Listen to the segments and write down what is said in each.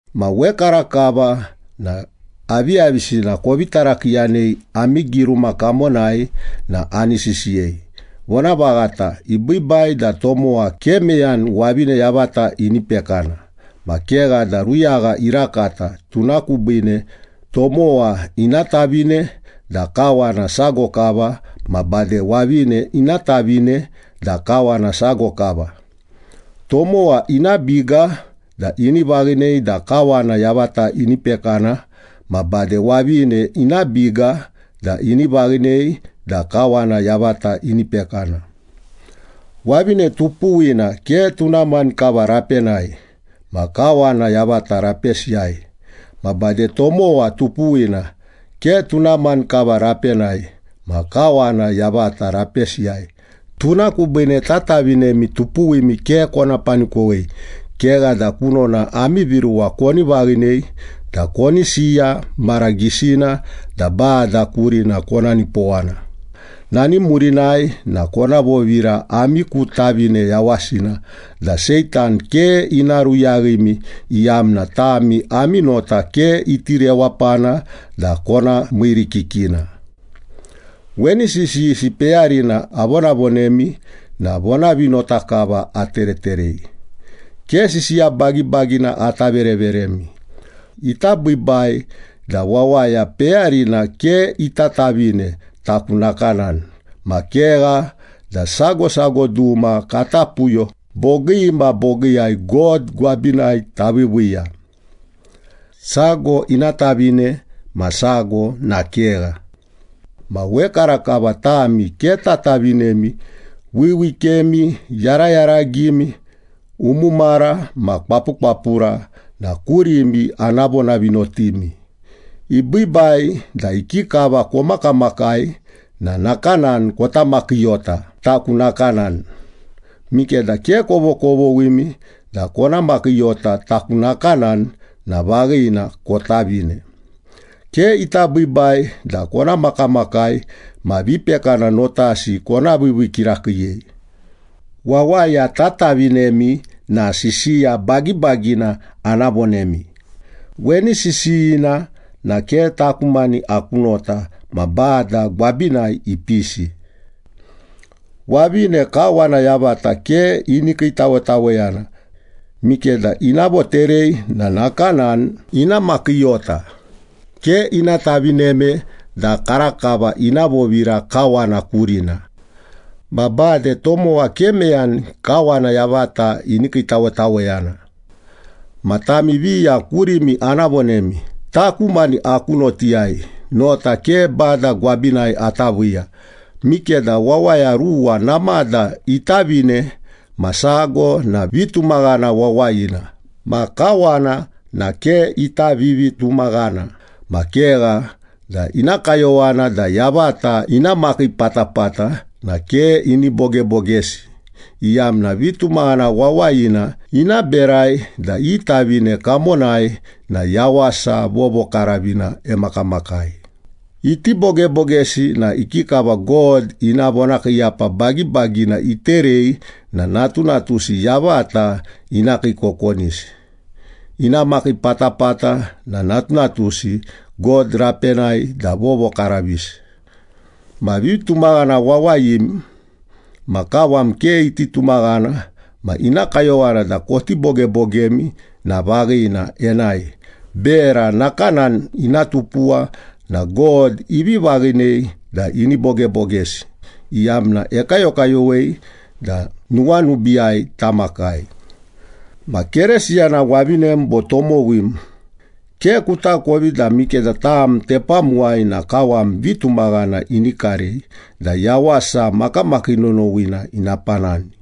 Ma wekarakava na aviyavisina kovi tarakiiyanei ami giruma kamonai na ani sisiyei. Vonavaghata, ibiibai da tomowa ke meyani wavine yavata ini pekana. Ma kegha da ruyagha irakata, tuna kubiine tomowa ina tavine da kawana sago kava, ma bade wavine ina tavine da kawana sago kava. Tomowa ina biga da ini vaghinei da kawana yavata ini pekana ma bade wavine ina biga da ini vaghinei da kawana yavata ini pekana. Wavine tupuwina ke tuna mani kava rapenai ma kawana yavata rapesiyai. Ma bade tomowa tupuwina ke tuna mani kava rapenai ma kawana yavata rapesiyai. Tuna kubiine tatavinemi tupuwimi ke kona panikowei, kegha da kunona ami viruwa koni vaghinei da koni siya mara gisina da Bada kurina kona nipowana. Nani murinai na kona vovira ami ku tavine yawasina da Seitan ke ina ruyaghimi, iyamna tami ami nota ke iti rewapana da kona miirikikina. Weni sisiyisi peyarina avonavonemi na vonavinota kava atereterei, ke sisiya bagibagina ata vereveremi. Ita biibai da wawaya peyarina ke ita tavine, taku nakanani. Ma kegha da sago sago duma kata puyo bogii ma bogiiyai God gwabinai taviiviiya. Sago ina tavine ma sago na kegha. Ma wekarakava tami ke tatavinemi, wiwikemi, yarayaragimi, umumara ma kwapukwapura na kurimi ana vonavinotimi. Ibiibai da ikikava komakamakai na nakanani kota makiiyota, taku nakanani. Mikeda ke kovokovoghimi da kona makiiyota taku nakanani na vaghina, kotavine. Ke ita biibai da kona makamakai ma vipekana notasi kona viivii kirakiiyei. Wawaya tatavinemi na sisiya bagibagina ana vonemi. Weni sisiyina na ke taku mani aku nota ma Bada gwabinai ipisi. Wavine kawana yavata ke ini kiitawetaweyana. Mikeda ina voterei na nakanani ina makiiyota, ke ina tavineme da karakava ina vovira kawana kurina. Ma bade tomowa ke meyani kawana yavata ini kiitawetaweyana. Ma tami viya kurimi ana vonemi. Taku mani aku notiyai, nota ke Bada gwabinai ata viiya. Mikeda wawaya ruwa namada itavine ma sago na vitumaghana wawayina ma kawana na ke ita vivitumaghana ma kegha da ina kayowana da yavata ina makii patapata na ke ini bogebogesi, iyamna vitumaghana wawayina ina berai da i tavine kamonai na yawasa vovokaravina emakamakai. Iti bogebogesi na ikikava God ina vonakiiyapa bagibagina iterei na natunatusi yavata ina kiikokonisi? Ina makii patapata na natunatusi God rapenai da vovokaravisi. Ma vitumaghana wawayim ma kawam ke iti tumaghana ma ina kayowana da koti bogebogemi na vaghina, enae. Bera nakanani ina tupuwa na God ivi vaghinei da ini bogebogesi, iyamna ekayokayowei da nuwanubiiyai tamakai. Ma Keresiyana wavinem bo tomowim, ke kutakovi da mikeda tam tepamuwai na kawam vitumaghana ini karei da yawasa makamakii nonowina ina panani.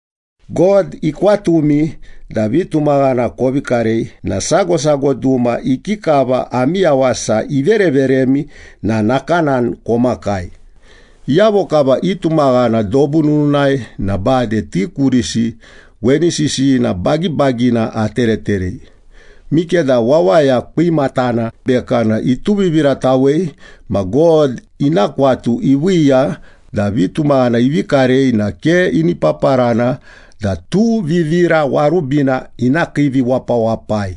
God ikwatumi da vitumaghana kovi karei na sago sago duma ikikava ami yawasa ivereveremi na nakanani komakai. Iyavo kava itumaghana dobu nununai na bade ti kurisi weni sisiyina bagibagina atereterei. Mikeda wawaya kwimatana bekana ituviviratawei ma God ina kwatu iviiya da vitumaghana ivi karei na ke ini paparana da tuvivira warubina ina kiiviwapawapai.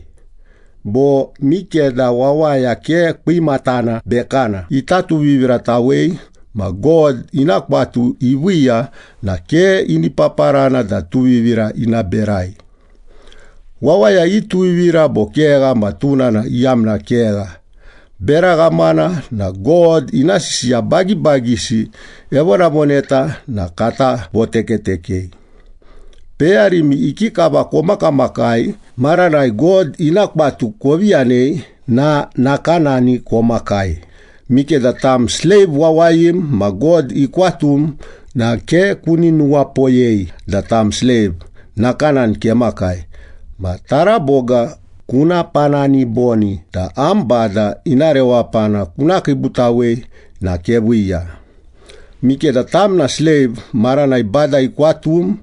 Bo mikeda wawaya ke kwimatana bekana ita tuviviratawei ma God ina kwatu iviiya na ke ini paparana da tuvivira ina berai. Wawaya ituvivira bo kegha ma tuna na iyamna kegha. Bera ghamana na God ina sisiya bagibagisi evonavoneta na kata votekatekei. Peyarimi ikikava komakamakai maranai God ina kwatu kovi yanei na nakanani komakai. Mikeda tam sleiv wawayim ma God ikwatum na ke kuni nuwapoyei da tam sleiv, nakanani kemakai. Ma taraboga kuna panani boni da am bada ina rewapana kuna kiibutawei na keviiya. Mikeda tam na sleiv maranai Bada ikwatum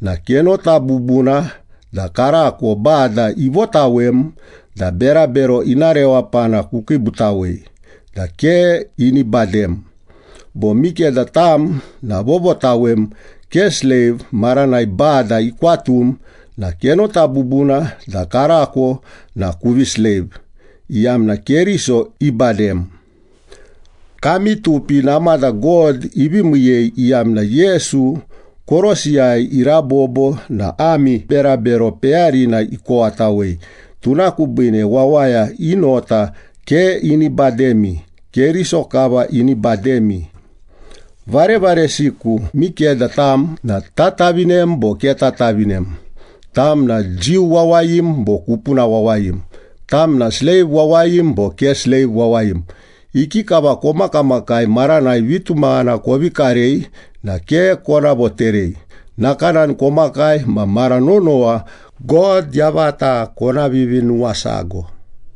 na kenota bubuna da karako Bada ivotawem da berabero ina rewapana kukiibutawei da ke ini badem. Bo mikeda tam na vovotawem, ke sleiv, maranai Bada ikwatum na kenota bubuna da karako na kuvi sleiv, iyamna Keriso ibadem. Kami tupi namada God ivi miiyei, iyamna Yesu korosiyai irabobo na ami berabero peyarina ikowatawei. Tuna kubiine wawaya i nota ke ini bademi, Keriso kava ini bademi. Varevaresiku, mikeda tam na tatavinem bo ke tatavinem, tam na Jiu wawayim bo kupuna wawayim, tam na sleiv wawayim bo ke sleiv wawayim, ikikava komakamakai maranai vitumaghana kovi karei na ke kona voterei. Nakanani komakai ma mara nonowa God yavata kona vivinuwasago.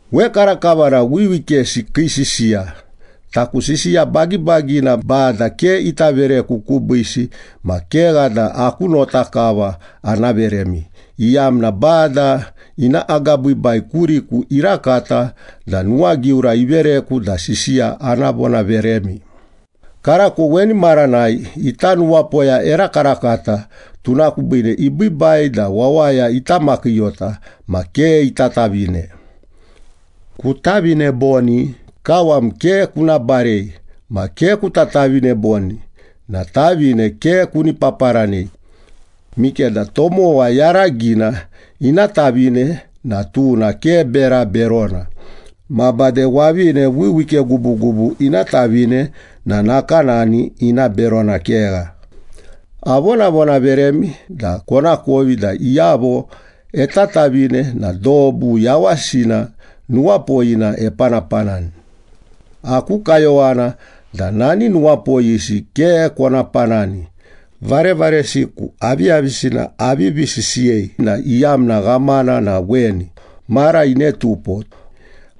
Wekarakava na wiwikesi kii sisiya. Taku sisiya bagibagina Bada ke ita vereku kubiisi, ma kegha da aku nota kava ana veremi, iyamna Bada ina agabiibai kuriku irakata da nuwagiura ivereku da sisiya ana vonaveremi. Karako weni maranai ita nuwapoya erakarakata, tuna kubiine ibiibai da wawaya ita makiiyota ma ke ita tavine. Kutavine boni? Kawam ke kuna barei. Ma ke kuta tavine boni? Na tavine ke kuni paparanei. Mikeda tomowa yaragina ina tavine na tuna ke bera berona, ma bade wavine wiwike gubugubu ina tavine na nakanani, ina berona kegha. Avonavonaveremi da konakovi da iyavo etatavine na dobu yawasina nuwapoyina epanapanani. Aku kayowana da nani nuwapoyisi ke kona panani. Varevaresiku, aviyavisina avivi sisiyei na iyamna ghamana na weni, mara inetupo.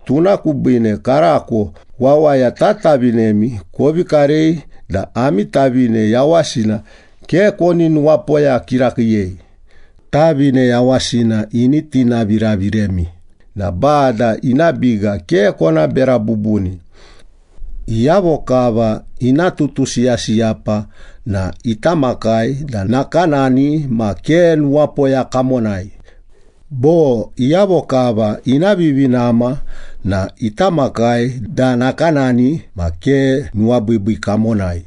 Tuna kubiine karako wawaya tatavinemi kovi karei da ami tavine yawasina ke koni nuwapoya kirakiiyei. Tavine yawasina ini tinaviraviremi na Bada ina biga ke kona bera bubuni. Iyavo kava ina tutusiyasiyapa na ita makai da nakanani ma ke nuwapoya kamonai. Bo, iyavo kava ina vivinama na ita makai da nakanani ma ke nuwabiibii kamonai.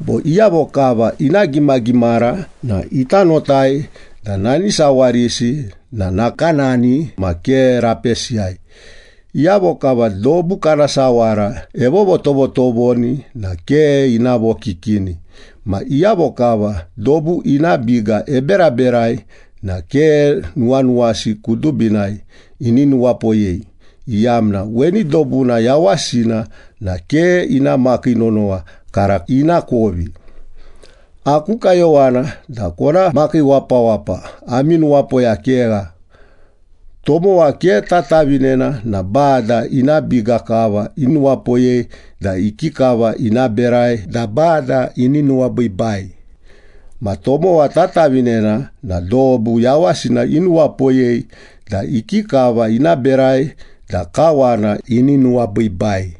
Bo, iyavo kava ina gimagimara na ita notai da nani sawarisi na nakanani ma ke rapesiyai. Iyavo kava dobu kana sawara evovotovotovoni na ke ina vokikini. Ma iyavo kava dobu ina biga eberaberai na ke nuwanuwasi kudubinai ini nuwapoyei, iyamna weni dobuna yawasina na ke ina makii nonowa, kara ina kovi. Aku kayowana da kona makiiwapawapa, ami nuwapoya kegha. Tomowa ke tatavinena na Bada ina biga kava inuwapoyei da ikikava ina berai da Bada ini nuwabiibai. Ma tomowa tatavinena na dobu yawasina inuwapoyei da ikikava ina berai da kawana ini nuwabiibai.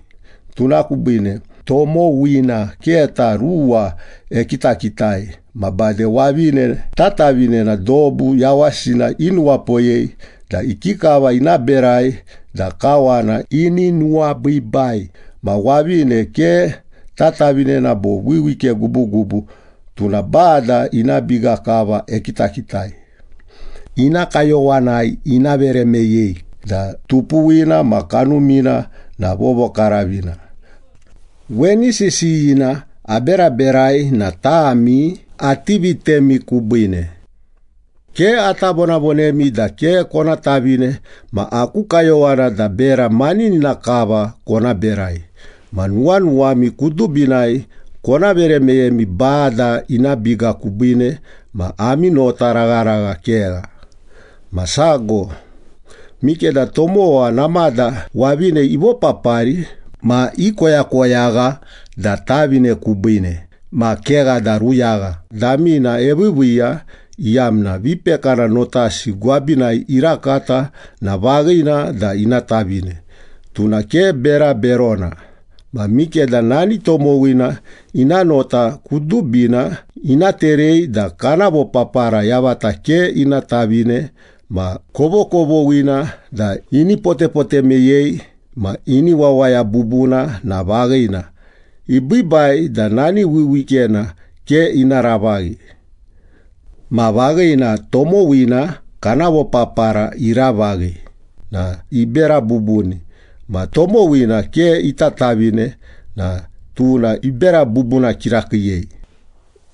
Tuna kubiine tomowina keta ruwa ekitakitai. Ma bade wavine tatavinena dobu yawasina inuwapoyei da ikikava ina berai da kawana ini nuwabiibai. Ma wavine ke tatavinena bo wiwike gubugubu tuna Bada ina biga kava ekitakitai. Ina kayowanai ina vere meyei da tupuwina ma kanumina na vovokaravina. Weni sisiyina aberaberai na tami ati vitemi kubiine. Ke ata vonavonemi da ke kona tavine, ma aku kayowana da bera maninina kava kona berai ma nuwanuwami kudubinai kona vere meyemi Bada ina biga kubiine ma ami notaragharagha kegha. Ma sago, mikeda tomowa namada wavine ivopapari ma ikoyakoyagha da tavine kubiine ma kegha da ruyagha damina eviiviiya, iyamna vipekana notasi gwabinai irakata na vaghina da ina tavine. Tuna ke bera berona. Ma mikeda nani tomowina ina nota kudubina ina terei da kana vopapara yavata ke ina tavine ma kovokovoghina da ini potepote meyei ma ini wawaya bubuna na vaghina, ibiibai da nani wiwikena ke ina ravaghi. Ma vaghina, tomowina kana vopapara iravaghi na ibera bubuni, ma tomowina ke ita tavine na tuna ibera bubuna kirakiiyei.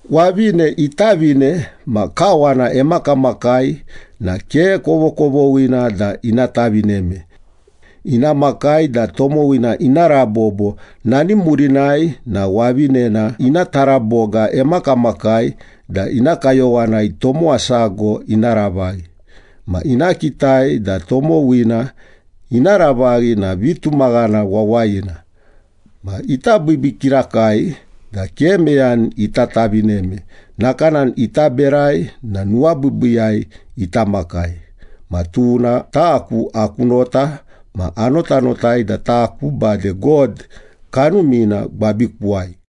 Wavine itavine ma kawana emakamakai na ke kovokovoghina da ina tavineme. Ina makai da tomowina ina rabobo, nani murinai na wavinena ina taraboga emakamakai da ina kayowanai tomowa sago ina ravaghi. Ma ina kitai da tomowina ina ravaghi na vitumaghana wawayina. Ma ita biibii kirakai da ke meyani ita tavineme, nakanani ita berai na nuwabiibiiyai ita makai. Ma tuna taku aku nota, ma anotanotai da taku bade God Kanumina gwabikuwai.